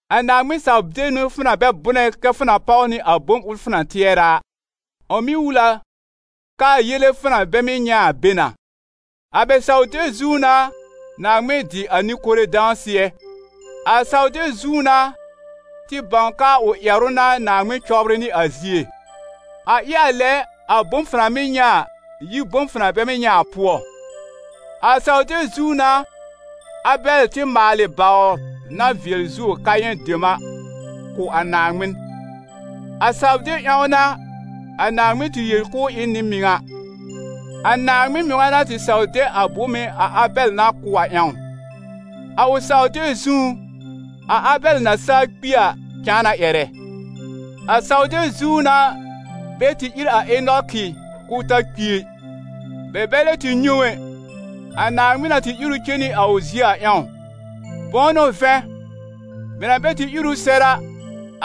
A Naaŋmɩn-saw-deb n'ɩ fʋ na bɛ bʋnɛ kɛ́ fʋ na páw nɩ a bom ʋl fʋ na tɩɛrɛ a, ʋ mɩ́ wul a kɛ a yele fʋ na bɛ mɩ́ nyɛ̃ a be na. A bɛ saw-deb zũú n'a Naaŋmɩn dɩ a nɩ-kore dãsɩɛ. A saw-deb zũú n'a tɩ bãw k'aa ʋ ƴɛrʋ n'a Naaŋmɩn cɔbrɩ nɩ a zie. A ɩ a lɛ, a bom fʋ na mɩ́ nyɛ̃ a, yi bom fʋ na bɛ mɩ́ nyɛ̃ a pʋɔ. A saw-deb zũú n'a Abɛl tɩ maalɩ bawr na vɩɛl zuo Kayɛ̃ dem a kʋ̀ a Naaŋmɩn. A saw-deb ƴãw n'a a Naaŋmɩn tɩ yel k'ʋʋ ɩ n nɩ-mɩŋa, a Naaŋmɩn mɩŋa na tɩ saw de a bome a Abɛl na kʋ̀ ʋ a ƴãw. A ʋ saw-deb zũú, a Abɛl na saa kpi a cãa na ƴɛrɛ. A saw-deb zũú n'a bɛ tɩ ír a Enɔkɩ, k'ʋʋ ta kpi ɛ; bɛ bɛ lɛ tɩ nyɛ̃ ʋ ɛ, a Naaŋmɩn na tɩ ír ʋ cen nɩ a ʋ zie a ƴãw. Bʋ̃ʋ n'ʋ vɛ̃, bɛ na bɛ tɩ ír ʋ sɛr a,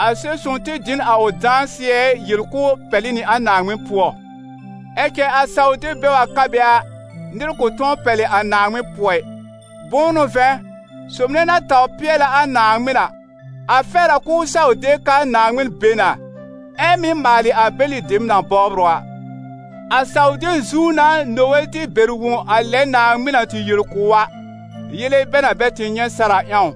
a Sɛb-sõw tɩ dɩ n a ʋ dãsɩɛ yel k'ʋʋ pɛlɩ nɩ a Naaŋmɩn pʋɔ. Ɛ cɛ a saw-deb bɛ wa ka be a, nɩr kʋ̃ tʋ̃ɔ pɛlɩ a Naaŋmɩn pʋɔ ɩ. Bʋ̃ʋ n'ʋ vɛ̃, sob nɛ na tawr pɩɛlɛ a Naaŋmɩn a, a fɛr a k'ʋʋ saw de k'aa Naaŋmɩn be na, ɛ mɩ́ maalɩ a bɛlɩ dem na bɔbr ʋ a. A saw-deb zũú n'a Nowe tɩ bɛr wõ a lɛ Naaŋmɩn na tɩ yel kʋ̀ ʋ a, yele bɛ na bɛ tɩ nyɛ̃ sɛr a ƴãw.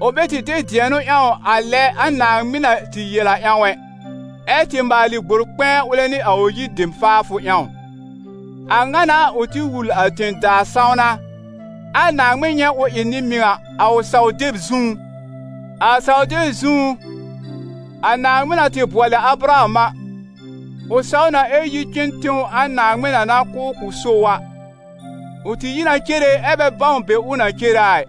Ʋ bɛ tɩ de dɩ̃ɛnʋ ƴãw a lɛ a Naaŋmɩn na tɩ yel a ƴãw ɛ, ɛ́ tɩ maalɩ gbor-kpɛ̃ɛ ʋlɛ nɩ a ʋ yir dem faafʋ ƴãw. A ŋa n'a ʋ tɩ wul a tẽ-daa sãwna, ɛ a Naaŋmɩn nyɛ̃ ʋ ɩ nɩ-mɩŋa, a ʋ saw-deb zũú. A saw-deb zũú, a Naaŋmɩn na tɩ bʋɔlɩ a Abraham a, ʋ saw na ɛ yi cen tẽw a Naaŋmɩn na na kʋ̀ ʋ k'ʋ so ʋ a. Ʋ tɩ yi na cere, ɛ bɛ bãw be ʋ na cere a ɩ.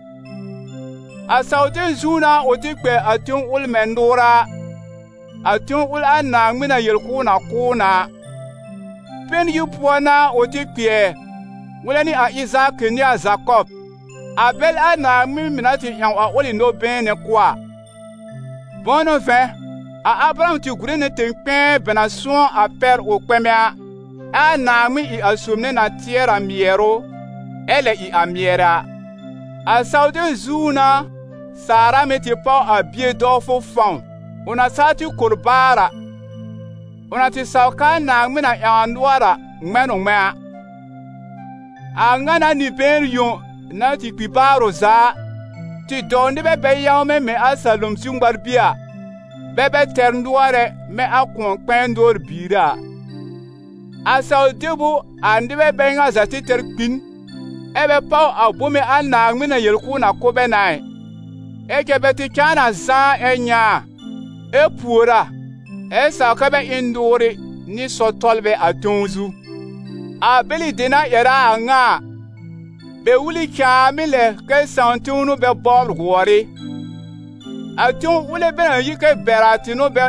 A saw-deb zũú n'a ʋ tɩ kpɛ a tẽw ʋl mɛ̃ nʋʋra a, a tẽw ʋl a Naaŋmɩn na yel k'ʋʋ na kʋ̀ ʋ na a. Pɛn-yir pʋɔ n'a ʋ tɩ kpɩɛr, ʋlɛ nɩ a Ɩzaakɩ nɩ a Zakɔb, a bɛl a Naaŋmɩn mɩ̀ na tɩ ƴãw a ʋlɩ nɔ-been nɛ kʋ̀ a. Bʋ̃ʋ n'ʋ vɛ̃, a Abraham tɩ gùre nɩ tẽ-kpɛ̃ɛ bɛ na sʋ̃ɔ a pɛr ʋ kpɛmɛ a, ɛ a Naaŋmɩn ɩ a sob nɛ na tɩɛrɩ a mɩɛrʋ, ɛ lɛ ɩ a mɩɛrɛ a. A saw-deb zũú n'a Saara mɩ̀ tɩ páw a bie dɔwfʋ fãw, ʋ na saa tɩ kor baar a; ʋ na tɩ saw k'aa Naaŋmɩn na ƴãw a nʋɔr a, ŋmɛ̃ n ʋ ŋmɛ̃a. A a ŋa n'a nɩ-been yõ, na tɩ kpi ʋ za baar a, tɩ dɔw nɩbɛ bɛ yãwmɛ mɛ̃ a salom zu ŋmar-bie a, bɛ bɛ tɛr nʋɔr ɛ, mɛ̃ a kʋ̃ɔ-kpɛ̃ɛ nʋɔr biire a. A saw-deb ʋ a nɩbɛ bɛ ŋa za tɩ tɛr kpi n, ɛ́ bɛ páw a bome a Naaŋmɩn na yel k'ʋʋ na kʋ̀ bɛ na ɩ, ɛ cɛ bɛ tɩ cãa na zãá ɛ nyɛ̃ a, ɛ pùor a, ɛ saw kɛ́ bɛ ɩ n nʋʋrɩ nɩ sɔr-tɔlbɛ a tẽw zu. A bɛlɩ dem na ƴɛrɛ a a ŋa a, bɛ wul ɩ cãàmɩ́ lɛ kɛ sãà-tẽw n'ʋ bɛ bɔbr gʋɔr ɩ. A tẽw ʋl bɛ na yi kɛ bɛr a tɩ n'ʋ bɛ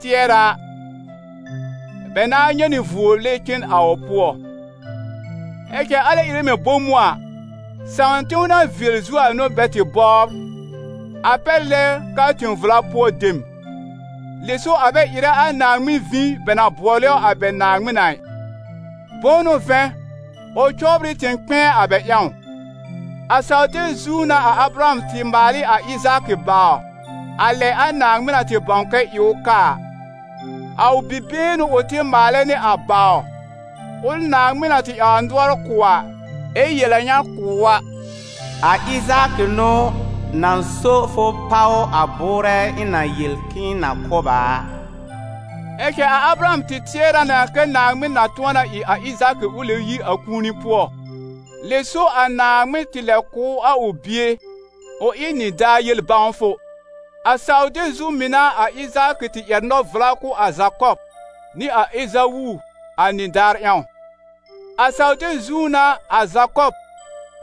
tɩɛrɛ a, bɛ nãá nyɛ̃ nɩ vuo lɛb cen a ʋ pʋɔ. Ɛ cɛ alɛ ɩrɛ mɛ̃ bom ʋ a, sãà-tẽw na vɩɛl zuo a n'ʋ bɛ tɩ bɔbr, a pɛr lɛ k'aa tẽ-vla pʋɔ dem. Lɛ so a bɛ ɩrɛ a Naaŋmɩn vĩ bɛ na bʋɔlɛ ʋ a bɛ Naaŋmɩn a ɩ; bʋ̃ʋ n'ʋ vɛ̃, ʋ cɔbr ɩ tẽ-kpɛ̃ɛ a bɛ ƴãw. A saw-deb zũú n'a a Abraham tɩ maal ɩ a Ɩzaakɩ bawr, a lɛ a Naaŋmɩn na tɩ bãw kɛ ɩ ʋ kaa a. A ʋ bi-been n'ʋ ʋ tɩ maalɛ nɩ a bawr, ʋl Naaŋmɩn na tɩ ƴãw a nʋɔr kʋ̀ a, ɛ yel a ŋa kʋ̀ ʋ a: «A Ɩzaakɩ n'ʋ na so fʋ páw a bʋʋrɛ ɩ̃ na yel k'ɩ̃ɩ na kʋ̀ b a a.» Ɛ cɛ a Abraham tɩ tɩɛrɛ na kɛ Naaŋmɩn na tʋ̃ɔ na ɩ a Ɩzaakɩ ʋ lɛb yi a kũuni pʋɔ, lɛ so a Naaŋmɩn tɩ lɛb kʋ̀ ʋ a ʋ bie, ʋ ɩ nɩdaar yel bãwfʋ. A saw-deb zũú mɩ̀ n'a a Ɩzaakɩ tɩ ƴɛr nɔ-vla kʋ̀ a Zakɔb nɩ a Ezawu a nɩdaar ƴãw. A saw-deb zũú n'a a Zakɔb,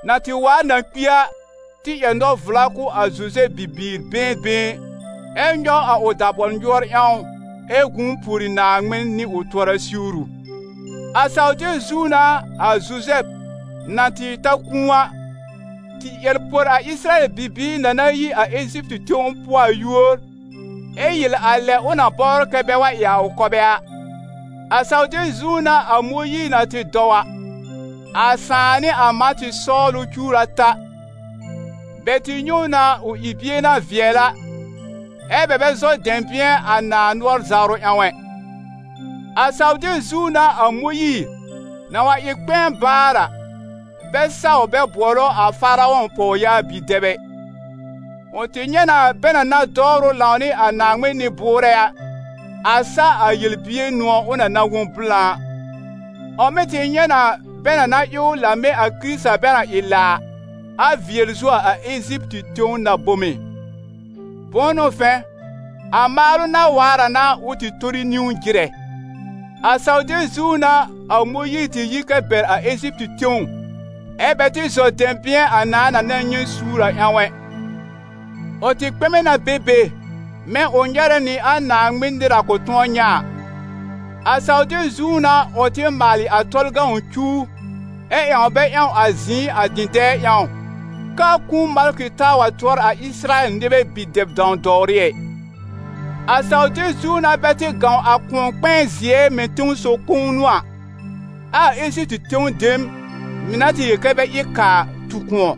na tɩ waar na kpi a, tɩ ƴɛr nɔ-vla kʋ̀ a Zuzɛb bibiir been been, ɛ nyɔw a ʋ dabɔl nyʋɔr ƴãw ɛ gũu pùori Naaŋmɩn nɩ ʋ tʋɔra siwru. A saw-deb zũú n'a a Zuzɛb, na tɩ ta kũu a, tɩ ƴɛr por a Ɩsɩrayɛl bibiir na na yi a Eziptɩ tẽw pʋɔ a yúor, ɛ yel a lɛ ʋ na bɔbr kɛ bɛ wa ɩ a ʋ kɔbɛ a. A saw-deb zũú n'a a Mõyiir na tɩ dɔw a, a sãà nɩ a mã tɩ sɔwl ʋ cuwr ata; bɛ tɩ nyɛ̃ ʋ na ʋ ɩ bie na vɩɛl a, ɛ́ bɛ bɛ zɔ dɛ̃bɩ̃ɛ a nãà nʋɔr zawrʋ ƴãw ɛ. A saw-deb zũú n'a a Mõyiir, na wa ɩ kpɛ̃ɛ baar a, bɛ saw bɛ bʋɔlɛ ʋ a Faarɔ̃ pɔwyaa bi-dɛb ɛ. Ʋ tɩ nyɛ̃ na, bɛ na na dɔwrɩ ʋ lãwnɩ a Naaŋmɩn nɩ-bʋʋrɛ a, a sa a yel-bier nʋ̃ɔ̀ ʋ na na wõ blã a. Ʋ mɩ̀ tɩ nyɛ̃ na, bɛ na na ɩ ʋ la mɛ̃ a Kɩrɩta bɛ na ɩ la a, a vɩɛl zuo a Eziptɩ tẽw na-bome; bʋ̃ʋ n'ʋ vɛ̃, a maalʋ na waar a n'a ʋ tɩ tori niwn jɩrɛ. A saw-deb zũú n'a a Mõyiir tɩ yi kɛ bɛr a Eziptɩ tẽw, ɛ́ bɛ tɩ zɔ dɛ̃bɩ̃ɛ a nãà na na nyɛ̃ suur a ƴãw ɛ; ʋ tɩ kpɛmɛ na be be, mɛ̃ ʋ nyɛrɛ nɩ a Naaŋmɩn nɩr na kʋ̃ tʋ̃ɔ nyɛ̃ a. A saw-deb zũú n'a ʋ tɩ maalɩ a Tɔlʋ cuw ɛ ƴãw bɛ ƴãw a zɩ̃ɩ a dɩ̃dɛɛ ƴãw, k'aa kũu malkɩ taa wa tʋɔr a Ɩsɩrayɛl nɩbɛ bi-dɛb-dãw-dɔwrɩ ɛ. A saw-deb zũú n'a bɛ tɩ gãw a Kʋ̃ɔ-kpɛ̃ɛ-zɩɛ mɛ̃ tẽsɔw kõw n'ʋ a, ɛ a Eziptɩ tẽw dem, mɩ̀ na tɩ yel kɛ bɛ ɩ kaa a, tu kʋ̃ɔ.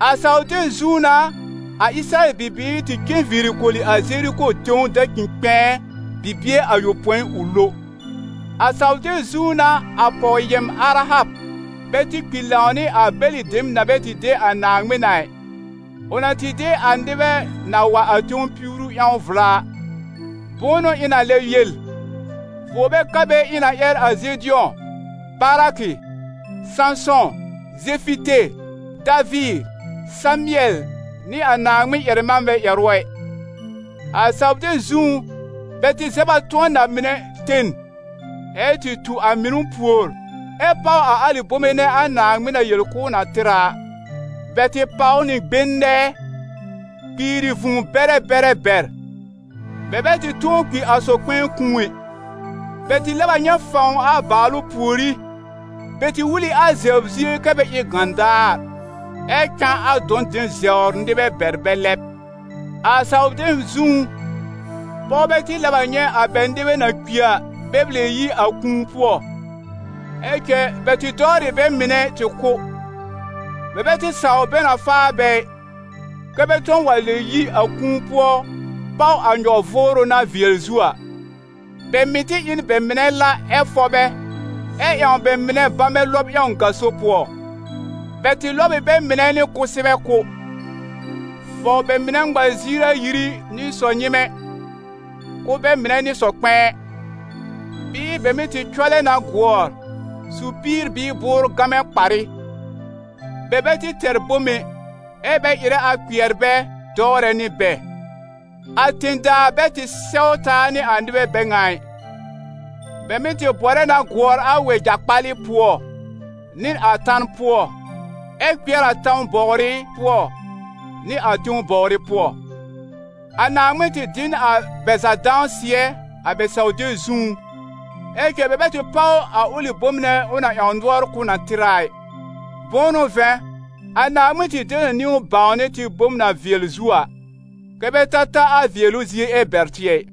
A saw-deb zũú n'a a Ɩsɩrayɛl bibiir tɩ cen viiri koli a Zeriko tẽw dacĩ-kpɛ̃ɛ, bibie ayopõi, ʋ lo. A saw-deb zũú n'a a pɔw-yɛm Arahab bɛ tɩ kpi lãw nɩ a bɛlɩ dem na bɛ tɩ de a Naaŋmɩn a ɩ, ʋ na tɩ de a nɩbɛ na wa a tẽw piwru ƴãw vla a. Bʋ̃ʋ n'ʋ ɩ̃ na lɛb yel? Vuo bɛ ka be ɩ̃ na ƴɛr a Zedɩ̃ɔ, Barakɩ, Sãsɔ̃, Zɛfɩte, Daviir, Samɩɛl nɩ a Naaŋmɩn ƴɛr-manbɛ ƴɛrʋ ɛ. A saw-deb zũú, bɛ tɩ zɛb a tʋ̃ɔ na-mɩnɛ ten, ɛ tɩ tu a mɩnʋ pùor, ɛ páw a alɩ bome nɛ a Naaŋmɩn na yel k'ʋʋ na tɩr a a. Bɛ tɩ pàw nɩ gben nɛɛ, kpiiri vũu-bɛrɛ bɛrɛ bɛr, bɛ bɛ tɩ tʋ̃ɔ kpi a sɔ-kpɛ̃ɛ kũu ɛ. Bɛ tɩ lɛb a nyɛ̃ fãw a bàalʋ pùorí, bɛ tɩ wul ɩ a zɛbr zie kɛ́ bɛ ɩ n gãdaar, ɛ cã a dɔ̃ dem zɛbr nɩbɛ bɛr bɛ lɛb. A saw-deb zũú, pɔwbɛ tɩ lɛb a nyɛ̃ a bɛ nɩbɛ na kpi a, bɛ lɛb yi a kũu pʋɔ. Ɛ cɛ bɛ tɩ dɔwr ɩ bɛ mɩnɛ tɩ kʋ́; bɛ bɛ tɩ saw bɛ na faa bɛ ɩ, kɛ́ bɛ tʋ̃ɔ wa lɛb yi a kũu pʋɔ páw a nyɔ-vʋʋrʋ na vɩɛl zuo a. Bɛ mɩ̀ tɩ ɩ n bɛ mɩnɛ la ɛ fɔb bɛ, ɛ ƴãw bɛ mɩnɛ bamɛ lɔb ƴãw gaso pʋɔ. Bɛ tɩ lɔb ɩ bɛ mɩnɛ nɩ kʋsɛbɛ kʋ́, fɔw bɛ mɩnɛ ŋma ziir ayiri nɩ sɔ-nyɩmɛ, kʋ́ bɛ mɩnɛ nɩ sɔ-kpɛ̃ɛ. Bɩɩ bɛ mɩ́ tɩ cɔlɛ na gʋɔr, su píir bɩɩ bʋʋr gamɛ kparɩ. Bɛ bɛ tɩ tɛr bom ɛ, ɛ́ bɛ ɩrɛ a kpɩɛr bɛ, dɔwrɛ nɩ bɛ. A tẽ-daa bɛ tɩ sɛw taa nɩ a nɩbɛ bɛ ŋa ɩ. Bɛ mɩ́ tɩ bɔrɛ na gʋɔr a wɛja-kpalɩ pʋɔ nɩ a tan pʋɔ, ɛ kpɩɛr a tãw bɔwrɩ pʋɔ nɩ a tẽw bɔwrɩ pʋɔ. A Naaŋmɩn tɩ dɩ n a bɛ za dãsɩɛ a bɛ saw-deb zũú, ɛ cɛ bɛ bɛ tɩ páw a ʋlɩ bom nɛ ʋ na ƴãw nʋɔr k'ʋʋ na tɩr a a ɩ. Bʋ̃ʋ n'ʋ vɛ̃, a Naaŋmɩn tɩ de nɩ niwn bãwnɩ tɩ bom na vɩɛl zuo a, kɛ́ bɛ ta ta a vɩɛlʋ zie ɛ bɛr tɩ ɛ.